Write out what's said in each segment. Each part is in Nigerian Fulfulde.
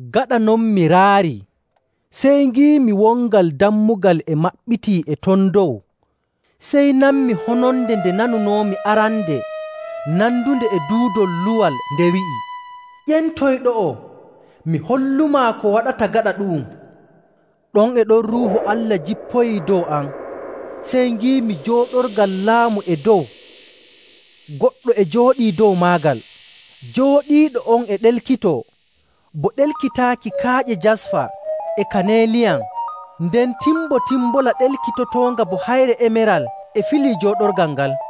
Gaɗa non mi raarii, sey ngiimi wongal dammugal e maɓɓitii e ton dow. Sey nanmi hononde nde nanunoomi arande nandunde e duudol luwal nde wi'i, “Ƴentoy ɗo'o, mi hollumaa ko waɗata gaɗa ɗu'um.” Ɗon e ɗon Ruuhu Allah jippoyii dow am, sey ngiimi jooɗorgal laamu e dow, goɗɗo e jooɗii dow maagal. Jooɗiiɗo on e ɗelkitoo bo ɗelkitaaki kaaƴe jasfa e kaneeliyan. Nden timbotimbola ɗelkitotoonga bo hayre emeral e filii jooɗorgal ngal.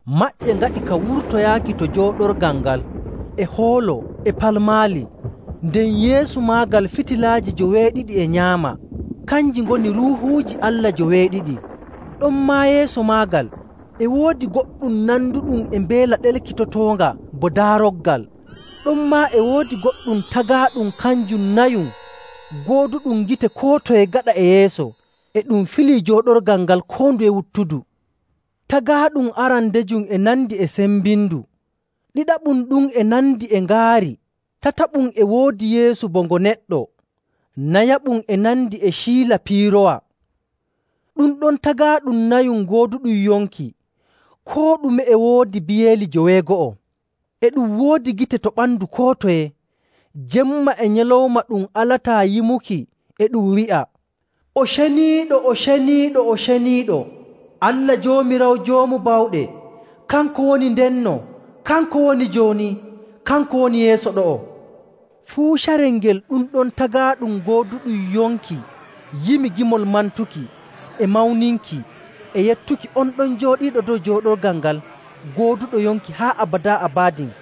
Maƴƴe ngaɗi ka wurtoyaaki to jooɗorgal ngal, e hoolo e palmaali, nden yeeso maagal fitilaaji joweeɗiɗi e nyaama, kanji ngoni Ruuhuuji Allah joweeɗiɗi. Ɗonmaa yeeso maagal e woodi goɗɗum nanduɗum e mbeela ɗelkitotoonga bo daaroggal. Ɗonmaa e woodi goɗɗum tagaaɗum kanjum nayum gooduɗum gite koo toye gaɗa e yeeso e ɗum filii jooɗorgal ngal koo nduye wuttudu. Tagaaɗum arandejum e nandi e sembindu, ɗiɗaɓum ɗum e nandi e ngaari, tataɓum e woodi yeeso bo ngo neɗɗo, nayaɓum e nandi e ciila piiroowa. Ɗum ɗon tagaaɗum nayum gooduɗum yonki, koo ɗume e woodi biyeeli joweego'o. E ɗum woodi gite to ɓandu koo toye. Jemma e nyalawma ɗum alataa yimuki e ɗum wi'a, “O ceniiɗo, o ceniiɗo, o ceniiɗo, Allah Joomiraawo Joomu Bawɗe, kanko woni ndenno, kanko woni jooni, kanko woni yeeso ɗo'o!” Fuu carel ngel ɗum ɗon tagaaɗum gooduɗum yonki yimi gimol mantuki, e mawninki, e yettuki on ɗon jooɗiiɗo dow jooɗorgal ngal gooduɗo yonki haa abadaa abadin,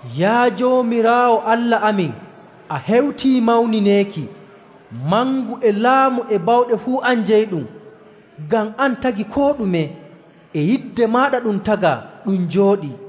“Yaa Joomiraawo Allah amin, a hewtii mawnineeki. Mangu e laamu e bawɗe fuu an jeyiɗum, ngam an tagi koo ɗume. E yidde maaɗa ɗum tagaa, ɗum jooɗii.”